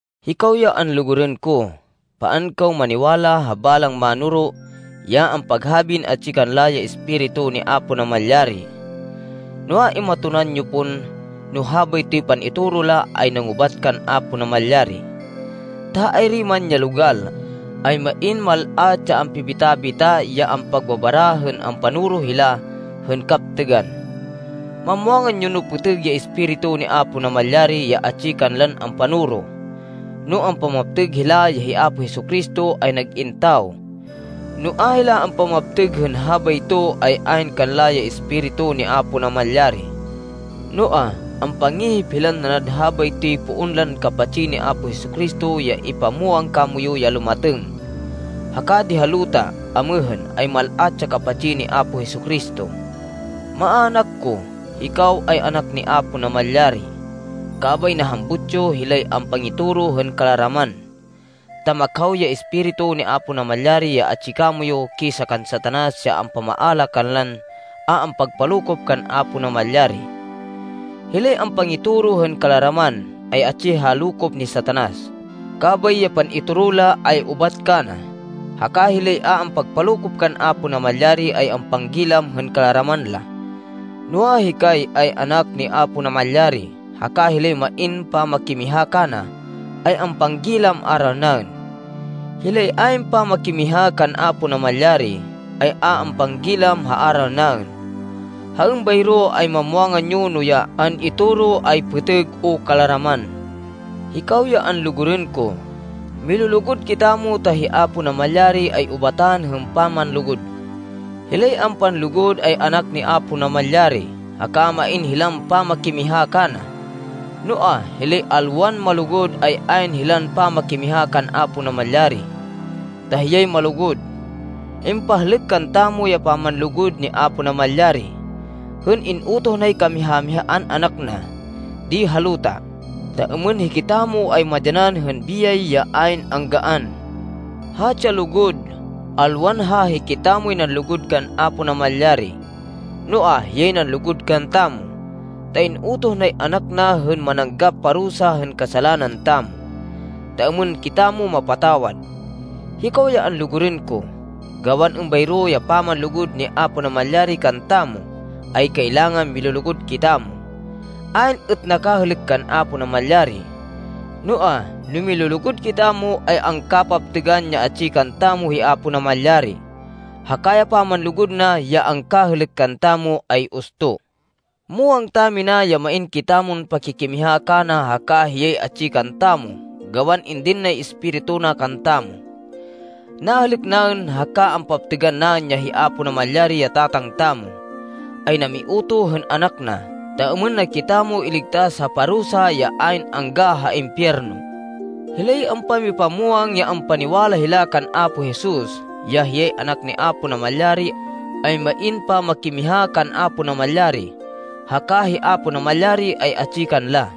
Hikaw ya anlugurên ko, paan kaw maniwala ha balang mánoro ya ampaghabin atsi kanla ya Espiritu ni Apo Namalyari. Noa, imatonan yo pon no habaytoy pan-itoro la ay nangubat kan Apo Namalyari, ta ha ayri man ya logal, ay main mal-at ya ampibita-bita ya ampagbabara hên ampanoro hila hên kaptêgan. Mamwangan yo no pêtêg ya Espiritu ni Apo Namalyari, ya atsi kanlan ampanoro, no ampamaptêg hila ya hi Apo Jesu-Cristo ay nag-in tawo. No a hila ampamaptêg hên habayto, ay ayn kanla ya Espiritu ni Apo Namalyari. Noa, ampangihip hilan nanad habaytoy poon lan kapatsi ni Apo Jesu-Cristo ya impamwang kamoyu ya lumatêng. Haka di ha luta amêhên ay mal-at ya kapatsi ni Apo Jesu-Cristo. Maának ko, hikaw ay anak ni Apo Namalyari. Kabay nahambut yo hilay ampangitoro hên kalaraman, ta makhaw ya Espiritu ni Apo Namalyari ya atsi kamoyu kisa kan Satanas ya ampamaala kanlan a ampagpalokop kan Apo Namalyari. Hilay ampangitoro hên kalaraman, ay atsi ha lokop ni Satanas, kabay ya pan-itoro la ay ubat kana. Haka hilay a ampagpalokop kan Apo Namalyari, ay ampanggilam hên kalaraman la. Noa, hikay ay anak ni Apo Namalyari, haka hilay main pamakimiha kana, ay ampanggilam aral naên. Hilay ayn pamakimiha kan Apo Namalyari, ay a ampanggilam ha aral naên. Ha êmbayro, ay mamwangan yo no ya an-itoro ay pêtêg o kalaraman. Hikaw ya anlugurên ko, milulugud kitamo ta hi Apo Namalyari ay ubatan hên pamanlugud. Hilay ampanlugud ay anak ni Apo Namalyari, haka main hilan pamakimiha kana. Noa, hilay alwan malugud ay ayn hilan pamakimiha kan Apo Namalyari, ta hiyay malugud. Impahlêk kantamo ya pamanlugud ni Apo Namalyari hên in-utoh nay kamiha-mihaan Anak na di ha luta, ta êmên hikitamo ay madyanan hên biyay ya ayn anggaan. Hatsi ya lugud: alwan ha hikitamoy nanlugud kan Apo Namalyari, noa, hiyay nanlugud kantamo, ta in-utoh nay Anak na hên mananggap parusa hên kasalanan tamo, ta êmên kitamo mapatawad. Hikaw ya anlugurên ko, gawan êmbayro ya pamanlugud ni Apo Namalyari kantamo ay kailangan milulugud kitamo. Ayn êt nakahêlêk kan Apo Namalyari. Noa, no milulugud kitamo, ay angkapaptêgan ya atsi kantamo hi Apo Namalyari, haka ya pamanlugud na ya angkahêlêk kantamo ay usto. Muwang tamina ya main kitamon pakikimiha kana haka hiyay atsi kantamo gawan indin nay Espiritu na kantamo. Nahêlêk naên, haka ampaptêgan naên ya hi Apo Namalyari, ya Tatang tamo, ay namiutoh hên Anak na ta êmên na kitamo iligtas ha parusa ya ayn angga ha impiyerno. Hilay ampamipamwang ya ampaniwala hila kan Apo Jesus, ya hiyay Anak ni Apo Namalyari, ay main pamakimiha kan Apo Namalyari haka hi Apo Namalyari ay atsi kanla.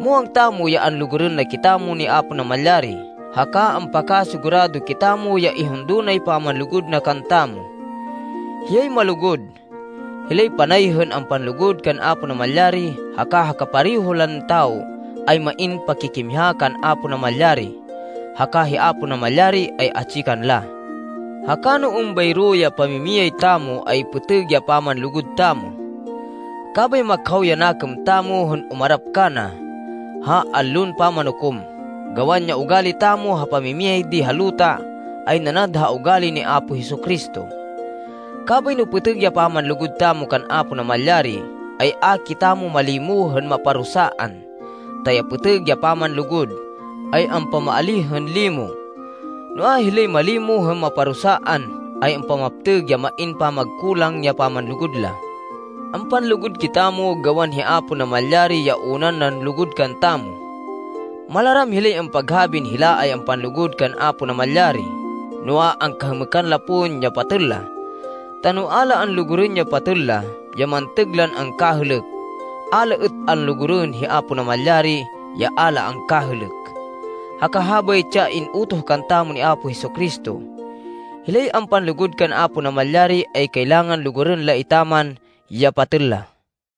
Muwang tamo ya anlugurên na kitamo ni Apo Namalyari haka ampakasigurado kitamo ya ihundo nay pamanlugud na kantamo. Hiyay malugud. Hilay panay hên ampanlugud kan Apo Namalyari haka ha kapareho lan tawo ay main pakikimiha kan Apo Namalyari, haka hi Apo Namalyari ay atsi kanla. Haka no êmbayro ya pamimiyay tamo, ay pêtêg ya pamanlugud tamo, kabay makhaw ya nakêm tamo hên umarap kana ha Allon Pamanukom, gawan ya ugali tamo ha pamimiyay di ha luta, ay nanad ha ugali ni Apo Jesu-Cristo. Kabay no pêtêg ya pamanlugud tamo kan Apo Namalyari, ay a kitamo malimo hên maparusaan, ta ya pêtêg ya pamanlugud, ay ampamaalíh hên limo. Noa, hilay malimo hên maparusaan, ay ampamaptêg ya main pamagkulang ya pamanlugud la. Ampanlugud kitamo gawan hi Apo Namalyari ya unan nanlugud kantamo. Malaram hilay ampaghabin hila ay ampanlugud kan Apo Namalyari noa, angkahêmêkan la pon ya patêl la. Ta no a la anlugurên ya patêl la, ya mantêg lan angkahêlêk, a la êt anlugurên hi Apo Namalyari ya a la angkahêlêk. Haka habaytsi ya in-utoh kantamo ni Apo Jesu-Cristo: hilay ampanlugud kan Apo Namalyari ay kailangan lugurên la etaman ya patêl la.